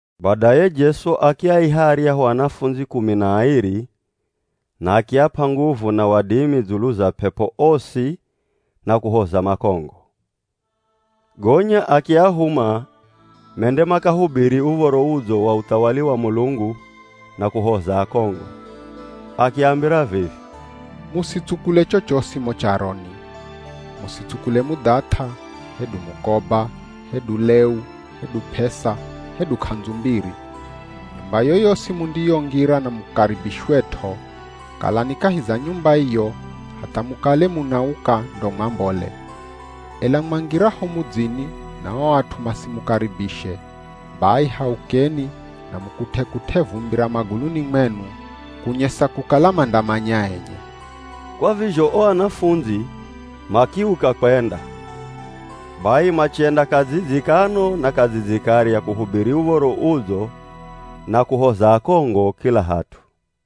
Badaye Jesu akiaiha aryahu anafundzi kumi na airi, na akiap'a nguvu na wadimi dzulu za p'ep'o osi na kuhoza makongo. Gonya akiahuma mende makahubiri Uv̱oro Udzo wa uthawali wa Mulungu na kuhoza akongo. Akiambira vivi, “Musitsukule chochosi mo charoni. Musitsukule mudhath'a, hedu mukoba, hedu leu, hedu p'esa, hedu k'andzu mbiri. Nyumba yoyosi mundiyongira na mukaribishwet'o, kalani kahi za nyumba iyo hatha mukale munauka ndo mwambole. Ela mwangiraho mudzini na o at'u masimukaribishe, bai haukeni na mukut'e-kut'e vumbi ra maguluni mwenu, kunyesa kukala mandamanya enye.” Kwa vizho o anafundzi makiuka kwenda. Bai machenda kadzidzi kano na kadzidzi karya kuhubiri Uv̱oro Udzo na kuhoza akongo kila hat'u.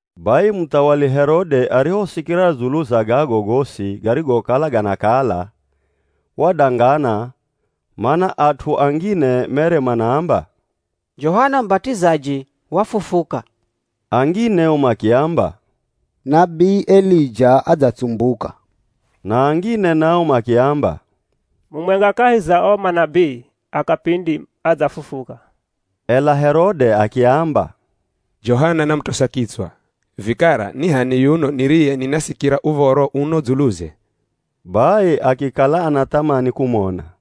Bai muthawali Herode arihosikira dzulu za gago gosi garigokala ganakala, wadangana, mana at'u angine mere manaamba, “Johana Mubat'izaji wafufuka.” Angine o makiamba, “Nabii Elija adzatsumbuka,” na angine nao makiamba, “Mumwenga kahi za o manabii a kapindi adzafufuka.” Ela Herode akiamba, “Johana namutosa kitswa, vikara ni h'ani yuno niriye ninasikira uv̱oro uno dzuluze?” Bai akikala anathamani kumona.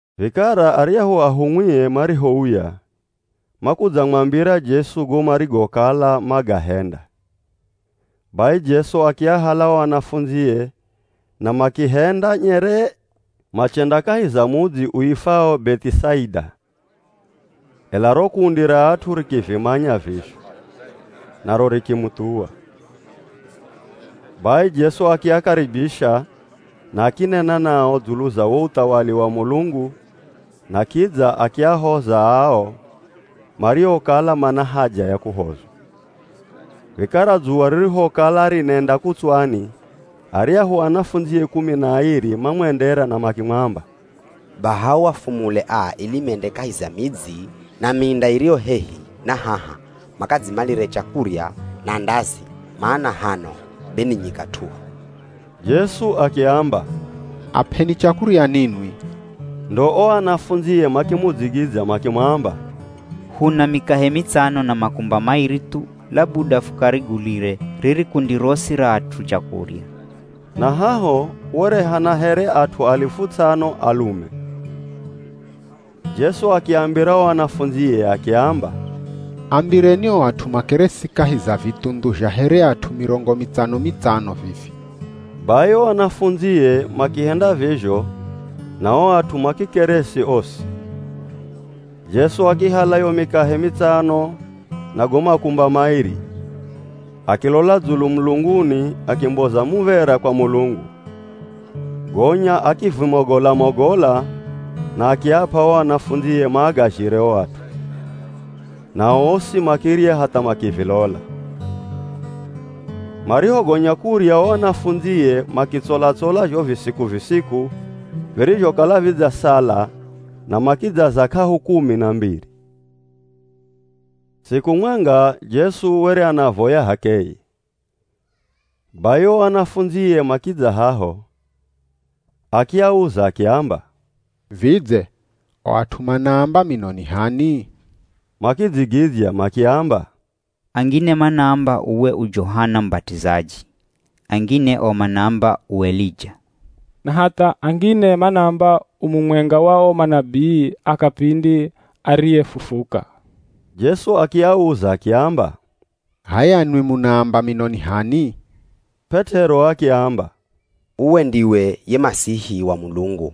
Vikara aryahu ahumwie marihouya, makudzamwambira Jesu go marigokala magahenda. Bai Jesu akiahala o anafundzie na makihenda nyeree, machenda kahi za mudzi uifwao Beth'isaida. Ela ro kundi ra at'u rikivimanya vizho, naro rikimuthuwa. Bai Jesu akiakaribisha na akinena nao dzulu za wo uthawali wa Mulungu na kidza akiahoza ao mariokala mana haja ya kuhozwa. Vikara dzuwa ririhokala rinenda kutswani aryahu anafundzie kumi na airi mamwendera na makimwamba, “Baha uafumule aa ili mende kahi za midzi na minda iriyo hehi na haha makadzimalire chakurya na ndazi, mana hano be ni nyika t'uhu.” Jesu akiamba, “Ap'eni chakurya ninwi.” Ndo o anafundzie makimudzigidzya makimwamba, “Huna mikahe mitsano na makumba mairi thu labuda fukarigulire riri kundi rosi ra at'u chakurya.” (Na haho were hana here at'u alifu ts'ano, alume.) Jesu akiambira o anafundzie akiamba, “Ambireni o at'u makeresi kahi za vithundhu zha here at'u mirongo mitsano-mitsano vivi.” Bai o anafundzie makihenda vizho na o at'u makikeresi osi. Jesu akihala yo mikahe mitsano na go makumba mairi, akilola dzulu mulunguni, akimboza muv̱era kwa Mulungu, gonya akivimogola-mogola na akiap'a o anafundzie maagazhire o at'u. Nao osi makirya hatha makivilola. Marihogonya kurya o anafundzie makitsola-tsola zho visiku-visiku virizhokala vidzasala na makidzaza k'ahu kumi na mbiri. Siku mwenga Jesu were anavoya h'akeye, bai o anafundzie makidza haho. Akiauza, akiamba, “Vidze o at'u manaamba mino ni h'ani?” Makidzigidzya makiamba, “Angine manaamba uwe u Johana Mubat'izaji, angine o manaamba, u Elija na hatha angine manaamba u mumwenga wa o manabii a kapindi ariyefufuka.” Jesu akiauza akiamba, “H'aya nwi, munaamba mino ni h'ani?” P'et'ero akiamba, “Uwe ndiwe ye Masihi wa Mulungu.”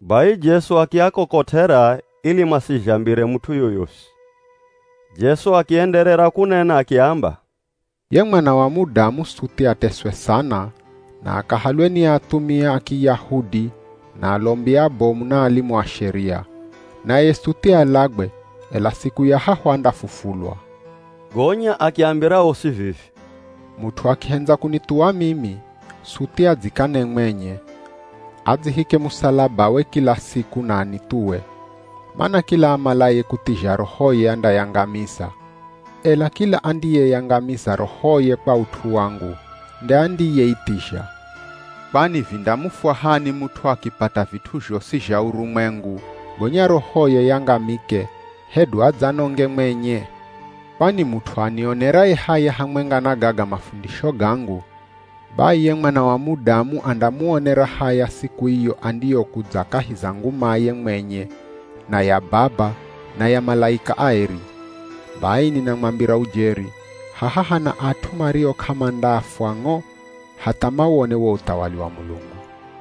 Bai Jesu akiakokot'era ili masizhambire mut'u yoyosi. Jesu akienderera kunena akiamba, “Ye Mwana wa Mudamu suthi ateswe sana, na akahalwe ni athumia a Kiyahudi na alombi abomu na alimu a Sheria. Naye suthi alagwe, ela siku ya hahu andafufulwa.” Gonya akiambira osi vivi, “Mut'u akihendza kunithuwa mimi, suthi adzikane mwenye, adzihike musalabawe kila siku na anithuwe. Mana kila amalaye kuthizha rohoye andayangamiza, ela kila andiyeyangamiza rohoye kwa ut'u wangu, nde andiyeithizha. Kwani vindamufwahani mut'u akipata vit'u zhosi zha urumwengu gonya rohoye yangamike hedu adzanonge mwenye? Kwani mut'u anioneraye haya hamwenga na gaga mafundisho gangu, bai ye Mwana wa Mudamu andamuonera haya siku iyo andiyokudza kahi za ngumaye mwenye na ya Baba na ya malaika aeri. Bai ninamwambira ujeri, haha hana at'u mario k'amandafwa ng'o hatha mawone wo uthawali wa Mulungu.”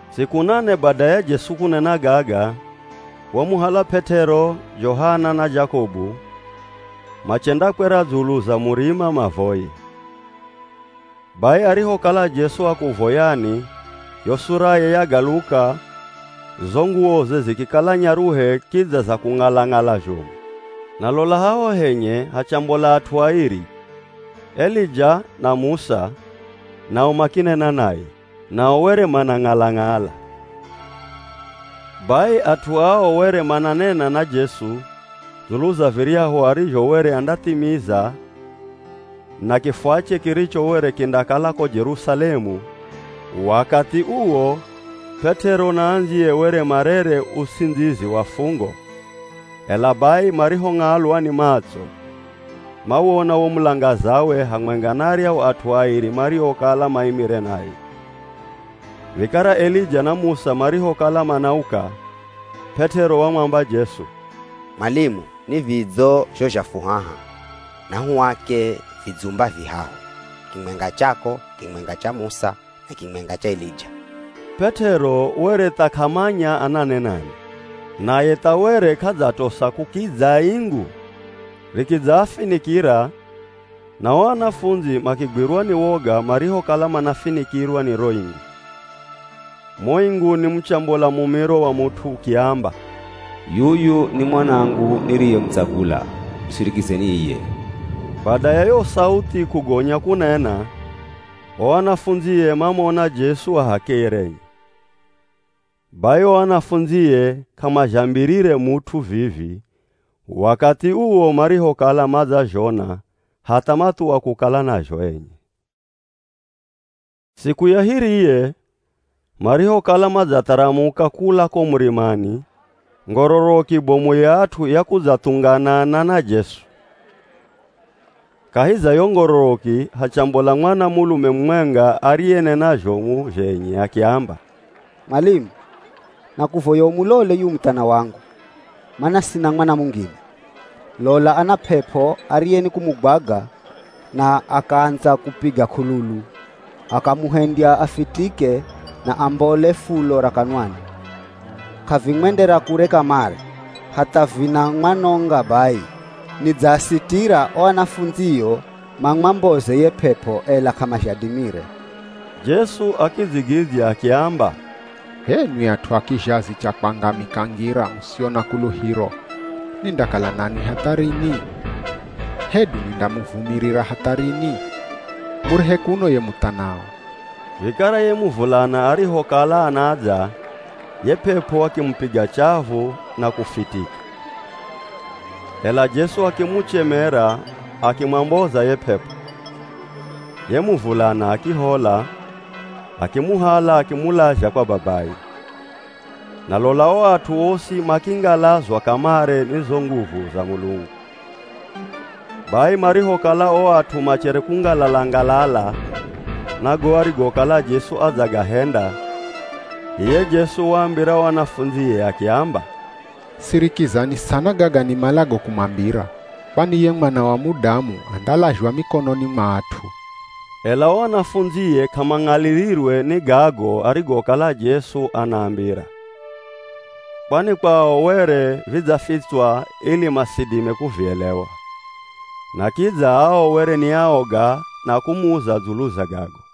Siku nane bada ya Jesu kunena gaga, wamuhala P'et'ero, Johana na Jakobu, machendakwera dzulu za murima mavoye. Bai arihokala Jesu akuvoyani yo suraye yagaluka, zo nguwoze zikikala nyaruhe kidza za kung'ala-ng'ala zhomu. Na lola haho henye hachambola at'u airi, Elija na Musa nao makinena naye. Nao were manang'ala-ng'ala. Bai at'u ao were mananena na Jesu dzulu za viryahu arizho were andathimiza na kifwache kiricho were kindakala ko Jerusalemu wakathi uwo P'et'ero na andziye were marere uts'indzizi wa fungo ela bai marihong'alwa ni matso, mawona wo mulangazawe hamwenga na aryahu at'u airi mariokala maimire naye. Vikara Elija na Musa marihokala manauka, P'et'ero wamwamba Jesu, “Mwalimu ni vidzo zho zha fu haha! Nahuake vidzumba vihahu, kimwenga chako, kimwenga cha Musa na kimwenga cha Elija.” P'et'ero were tha k'amanya ananenani. Naye tha were k'adzatosa kukidza ingu rikidzaafinikira, na o anafundzi makigwirwa ni woga marihokala manafinikirwa ni ro ingu. Mo inguni muchambola mumiro wa mut'u ukiamba, “Yuyu ni Mwanangu niriyemutsagula, musirikizeni iye.” Bada ya yo sauthi kugonya kunena, o anafundzie mamona Jesu a h'akeye renye. Bai o anafundzie k'amazhambirire mut'u vivi wakathi uwo marihokala madzazhona hatha mathuwa kukala nazho enye. Siku ya hiriye, marihokala madzatharamuka kula ko murimani, ngororoki bomu ya at'u yakudzathunganana na Jesu. Kahi za yo ngororoki hachambola mwanamulume mumwenga ariyenena zhomu zhenye akiamba, “Mwalimu, nakuvoya umulole yuyu muthana wangu, mana sina mwana mungine. Lola ana p'ep'o ariye nikumugwaga na akaandza kupiga k'ululu akamuhendya afitike na ambole fulo ra kanwani. K'avimwendera kure kamare, hatha vinamwanonga bai. Nidzaasitira o anafundzio mamwamboze ye p'ep'o ela k'amazhadimire.” Jesu akidzigidzya akiamba, “H'enwi at'u a kizhazi cha kwangamika ngira, musio na kuluhiro, nindakala nanwi hatha rini? Hedu nindamuvumirira hatha rini? Murehe kuno ye muthanao.” Vikara ye muvulana arihokala anadza ye p'ep'o akimupiga chavu na kufitika, ela Jesu akimuchemera akimwamboza ye p'ep'o, ye muvulana akihola, akimuhala akimulazha kwa babaye. Na lola o at'u osi makingalazwa kamare ni zo nguvu za Mulungu. Bai marihokala o at'u machere kungalala-ngalala na go arigokala Jesu adzagahenda, iye Jesu waambira o anafundzie akiamba, “Sirikizani sana gaga nimalago kumwambira. Kwani ye Mwana wa Mudamu andalazhwa mikononi mwa at'u.” Ela o anafundzie k'amang'alirirwe ni gago arigokala Jesu anaambira. Kwani kwao, were vidzafitswa ili masidime kuvielewa, na kidza ao were ni aoga na kumuza dzulu za gago.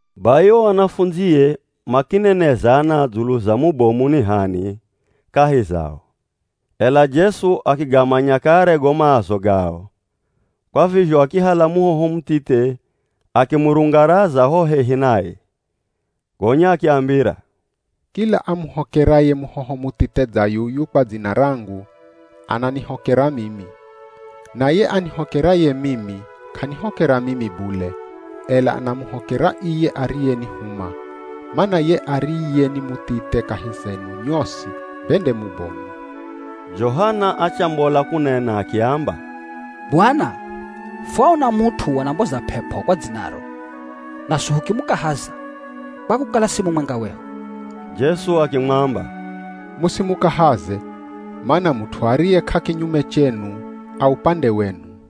Bai o anafundzie makinenezana dzulu za mubomu ni h'ani kahi zao. Ela Jesu akigamanya kare go maazo gao, kwa vizho akihala muhoho muthithe akimurungaraza ho hehi naye. Gonya akiambira, “Kila amuhokeraye muhoho muthithe dza yuyu kwa dzina rangu, ananihokera mimi, na ye anihokeraye mimi k'anihokera mimi bule, ela anamuhokera iye ariyenihuma, mana ye ariye ni muthithe kahi zenu nyosi be nde mubomu.” Johana achambola kunena akiamba, “Bwana, fwaona mut'u anamboza p'ep'o kwa dzinaro, naswi hukimukahaza, kwa kukala si mumwenga wehu.” Jesu akimwamba, “Musimukahaze, mana mut'u ariye k'akinyume chenu, a upande wenu.”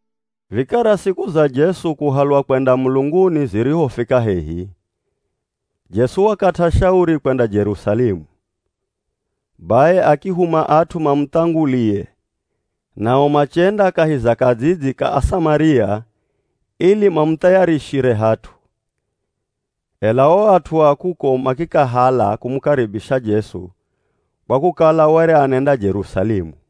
Vikara siku za Jesu kuhalwa kwenda mulunguni zirihofika hehi, Jesu wakat'a shauri kwenda Jerusalemu. Bai akihuma at'u mamuthangulie nao machenda kahi za kadzidzi ka Asamaria ili mamuthayarishire hat'u. Ela o at'u a kuko makikahala kumukaribisha Jesu kwa kukala were anenda Jerusalemu.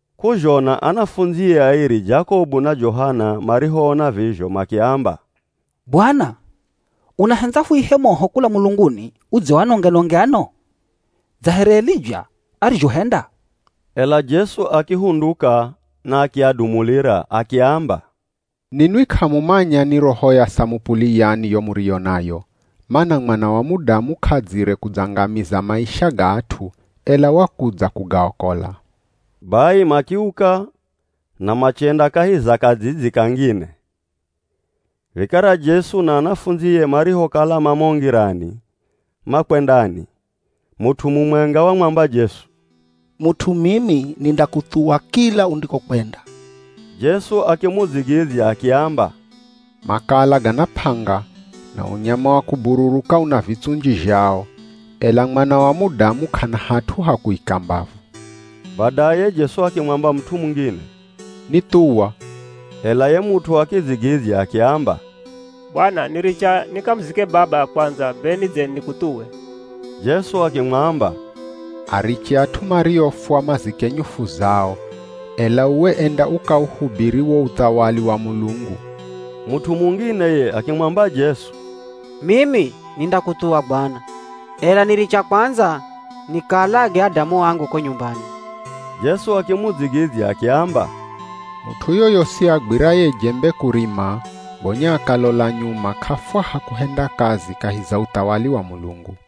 K'uzhona anafundzie airi, Jakobu na Johana marihoona vizho makiamba, “Bwana, unahendza fuihe moho kula mulunguni udze uanonge-nonge ano [dza here Elija arizhohenda]?” Ela Jesu akihunduka na akiadumulira, [akiamba, “Ninwi k'amumanya ni roho ya samupuli yani yo muriyo nayo. Mana Mwana wa Mudamu k'adzire kudzangamiza maisha ga at'u, ela wakudza kugaokola.”] Bai makiuka na machenda kahi za kadzidzi kangine. Vikara Jesu na anafundzie marihokala ma mo ngirani, makwendani, mut'u mumwenga wamwamba Jesu, “Mut'u mimi nindakuthuwa kila undikokwenda.” Jesu akimudzigidzya akiamba, “Makala gana p'anga, na unyama wa kubururuka una vitsunji zhao, ela Mwana wa Mudamu, k'ana hat'u ha kuika mbavu.” Badaye Jesu akimwamba mut'u mungine, “Nithuwa.” Ela ye mut'u akidzigidzya akiamba, “Bwana niricha nikamuzike baba kwandza be nidze nikuthuwe.” Jesu akimwamba, “Ariche at'u mariofwa mazike nyufu zao, ela uwe enda ukauhubiri wo uthawali wa Mulungu.” Mut'u mungine ye akimwamba Jesu, “Mimi nindakuthuwa Bwana, ela niricha kwandza nikaalage adamu angu ko nyumbani.” Jesu akimudzigidzya akiamba, “Mut'u yoyosi agwiraye jembe kurima gonya akalola nyuma k'afwaha kuhenda kazi kahi za uthawali wa Mulungu.”